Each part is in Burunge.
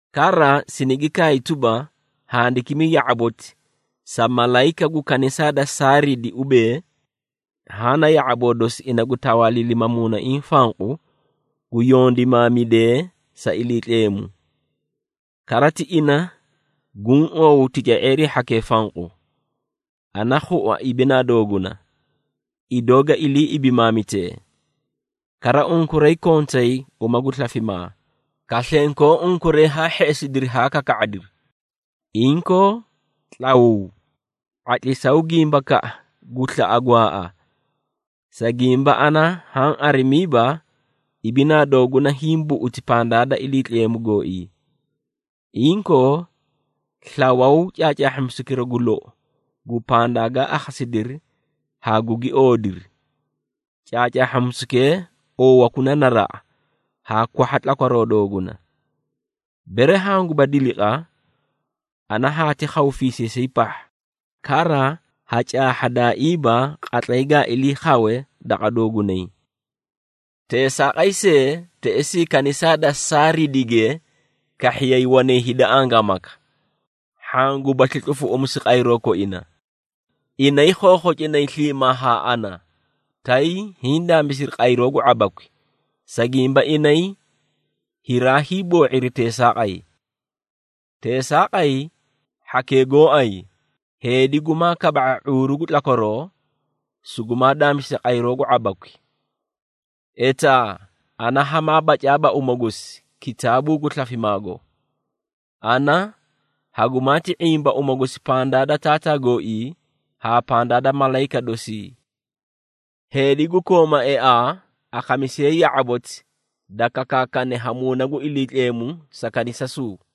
Kara sinigi kaay tuba, handikimi ya⁄aboti sa malayika gu kanisaa da Saaridi ubee, Haã na ya⁄aboo dosi, ina gu tawaaliilima Muunaiĩ fanqu, gu yondimaamidee sa Iliitleemu. Kara ti ina guũ oow tica⁄eerii hhakee fanqu. Ana khua ibinaa dooguna, idoo ga ilii ibimaamitee. Kara unkuray kontay uma gu slafimaa, kaslenkoo unkuray haa hheꞌesidi haa kaka⁄adiri. Inkoo tlawuu! ⁄atlisaw gimbakaꞌa gu slaꞌa gwaaꞌa. Sa gimba ana haã arimiiba, ibinaa dooguna hiĩ buꞌuti pandaa da Iliitleemu gooii. Inkoo, slawaw caacaahhamisukira gu lou gu pandaa gaa akhasidiri haa gugi oodiri. Caacahhamisukee oowakuna naraꞌa haa kwahha tlakwaroo dooguna. Bere hanguba diliqa, ana haati khaw fiisiisay pahha, kara ha caahhadaaiiba qatlay gaa ilii khawe daqa doogunay. Teesaaqay see, teꞌesii kanisaa da Saaridige, kahhiyay wanay hida angaamaka, hhaã gubasli tlufuꞌumisu qayroo koina. Inay khokhocinay sliimaa haa ana, tay hiĩ daamisiri qayroo gu ⁄abakwi, sa gimba inay hiraay boo⁄iri teesaaqay. Teesaaqay, hhakee gooay, heedi gumaa kaba⁄a ⁄uuru gu tlakwaroo, sugumaa daamisi qayroo gu ⁄abakwi. Etaa ana hamaa bacaaba uma gosi, kitaabuu gu slafimaago. Ana hagumaati ⁄imba uma gosi pandaa da Taataa gooii haa pandaa da malayika dosii. Heedi gu kooma eaa, akhamisiye ya⁄aboti, da kakaakane ha Muuna gu Iliitleemu sa kanisasuu.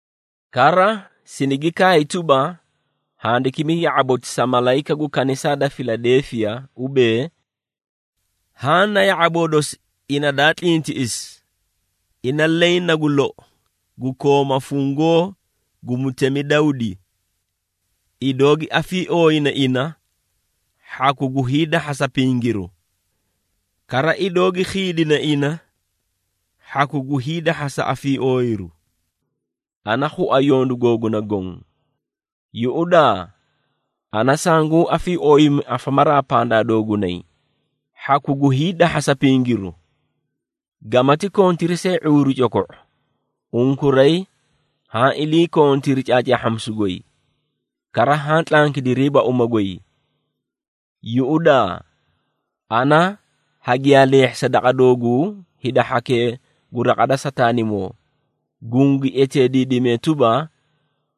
Kara sinigi kaay tuba, handikimi ya⁄aboti sa malayika gu kanisaa da Filadeefiya ubee, “Haã na ya⁄aboo dosi ina daa tlintiꞌisi, ina leẽ nagu lou, gu kooma fungoo gu mutemi Dawdi. Idoo gi afiiooyine ina, hhaku gu hiidahhasa pingiru, kara idoo gi khiidine ina, hhaku gu hiidahhasa afiiooyiru. Ana khua yondu googuna goõ. Yuꞌudaa! Ana sanguũ afiiooyimi afamaraa pandaa doogunay, hhaku gu hiidahhasa pingiru. Gamati kontiri see ⁄uuru coko⁄o, unkuray haã iliikontiri caacaahhamisu goy, kara haã tlankidiriiba uma goy. Yuꞌudaa! Ana hagiyaa leehhisa daqa dooguu hida hhakee gu raqa da Sataanimoo, gungi eteediidimee tuba,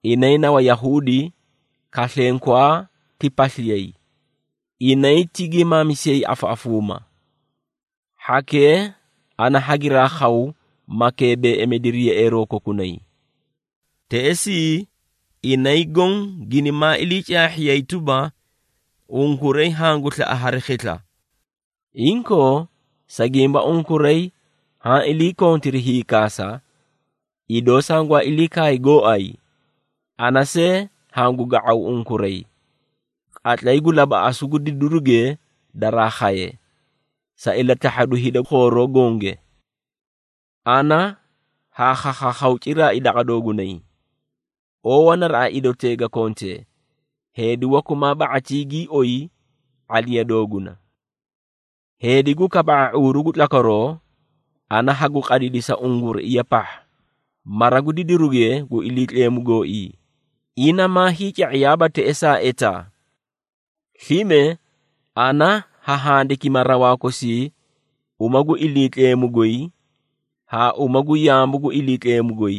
inay na Wayahuudi kaslenkwaa ti pasliyay, inay ti giimaamisiyay afaꞌafuuma. Hhakee ana hagiraa khaw maa keebeeꞌemidiri yeꞌeeroo kokunay. Teꞌesii, inay goõ ginimaa ilii caahhiyay tuba, unkuray hangu slaꞌa hari khisla. Inkoo, sa gimba unkuray haã iliikontiri hiikaasa, idoo sangwaa ilii kaay gooay, ana see hangu ga⁄aw unkuray, qatlay gu labaꞌasu gu didiruge daraa khaye, sa ilatahhadu hida khooroo gonge. Ana haa khakhaakhaw ciraai daqa doogunay. Oowa naraꞌa idotee ga kontee, heedi waku maa ba⁄atii gii oyi ⁄aliya dooguna. Heedi gu kaba⁄a ⁄uuru gu tlakwaroo, ana hagu qadidisa unguruiya pahha, mara gu didiruge gu Iliitleemu gooii, ina maa hiica⁄iyaaiiba teꞌesaa etaa. Slime, ana ha handikima rawaa kosii uma gu Iliitleemu goy haa uma gu yaamu gu Iliitleemu goy,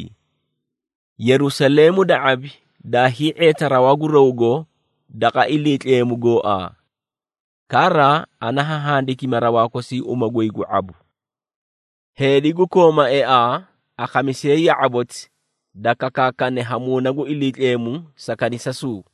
Yerusaleemu da ⁄abi daa hii⁄eeta rawaa gu rawgo daqa Iliitleemu gooaa. Kara, ana ha handikima rawaa kosii uma goy gu ⁄abu. Heedi gu kooma eaa, akhamisiye ya⁄aboti da kakaakane ha Muuna gu Iliitleemu sa kanisasuu.”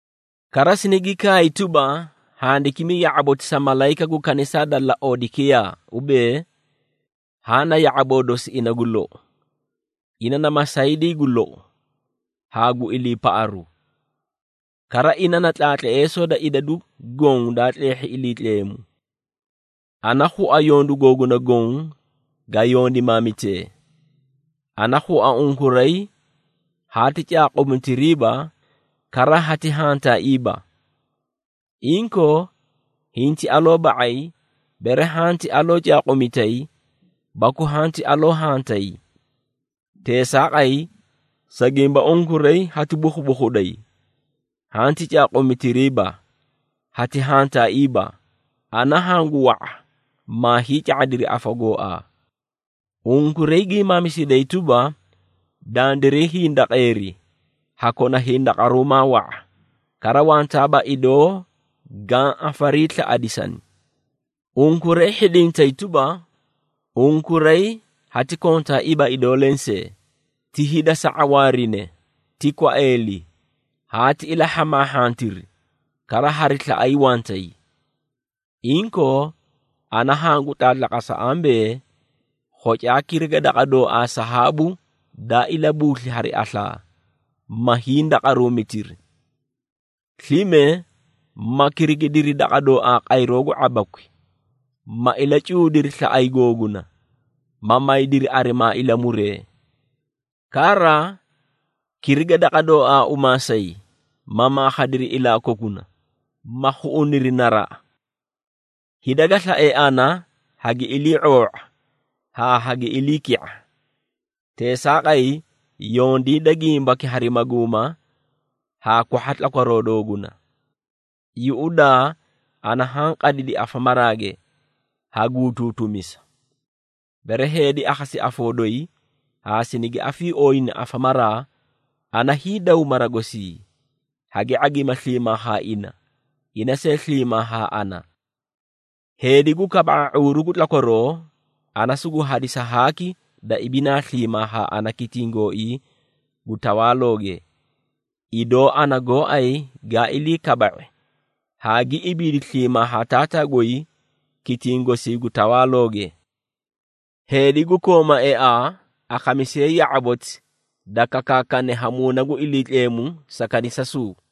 kara sinigi kaay tuba, handikimi ya⁄aboti sa malayika gu kanisaa da Laodekiyaa ubee, “Haã na ya⁄aboo dosi ina Gu lou, ina na masaydii gu lou haa gu iliipaꞌaru. Kara ina na tlaatleesoo da idadu goõ daa tleehhi Iliitleemu. Ana khua yondu googuna goõ ga yondimaamitee. Ana khua unkuray haati caaquumitiriiba kara hati hantaaiiba. Inkoo, hinti aloo ba⁄ay bere hanti aloo caaquumitay baku hanti aloo hantay! Teesaaqay, sa gimba unkuray hati bukhubukhuday, hanti caaquumitiriiba, hati hantaaiiba, ana hangu wa⁄a maa hiica⁄adiri afa gooaa. Unkuray giimaamisiday tuba, ‘Dandiray hindaqeeri, ha kona hindaqaruumaa wa⁄a, kara wantaaba idoo gaã afariislaꞌadisani.’ Unkuray hhidintay tuba, unkuray hati kontaaiiba idoo lensee, ti hida sa ⁄awaarine, ti kwaeeli, haati ilahhamaahhantiri, kara hari slaꞌay wantay. Inkoo, ana hangu tlaatlaqasa ambee, khocaa kirigi daqa dooaa sahaabu daa ilabuusli hari aslaa, ma hindaqaruumitiri. Slime ma kirigidiri daqa dooaa qayroo gu ⁄abakwi, ma ilacuudiri slaꞌay googuna ma maydiri arimaa ilamuree. Kara kiriga daqa dooaa umaasay, ma makhadiri ilaa kokuna, ma khuꞌuniri naraꞌa. Hida ga slae ana, hagi ilii⁄oo⁄a haa hagi iliiki⁄a. Teesaaqay, yondiida gimbaki hari maguuma haa kwahha tlakwaroo dooguna. Yuꞌudaa! Ana haã qadidi afamaraage, ha guutuutumisa. Bere heedi akhasi afoo doyi haa sinigi afiiooyina afamaraa, ana hiidaw mara gosii, hagi ⁄agima sliimaa haa ina, ina see sliimaa haa ana. Heedi gu kaba⁄a ⁄uuru gu tlakwaroo, ana sugu hadisa haaki da ibinaa sliimaa haa ana kitiĩ gooii gu tawaalooge, idoo ana gooay gaa ilii kaba⁄i haa gi ibiidi sliimaa haa Taataa goy kitiĩ gosii gu tawaalooge. Heedi gu kooma eaa, akhamisiye ya⁄aboti, da kakaakane ha Muuna gu Iliitleemu sa kanisasuu.”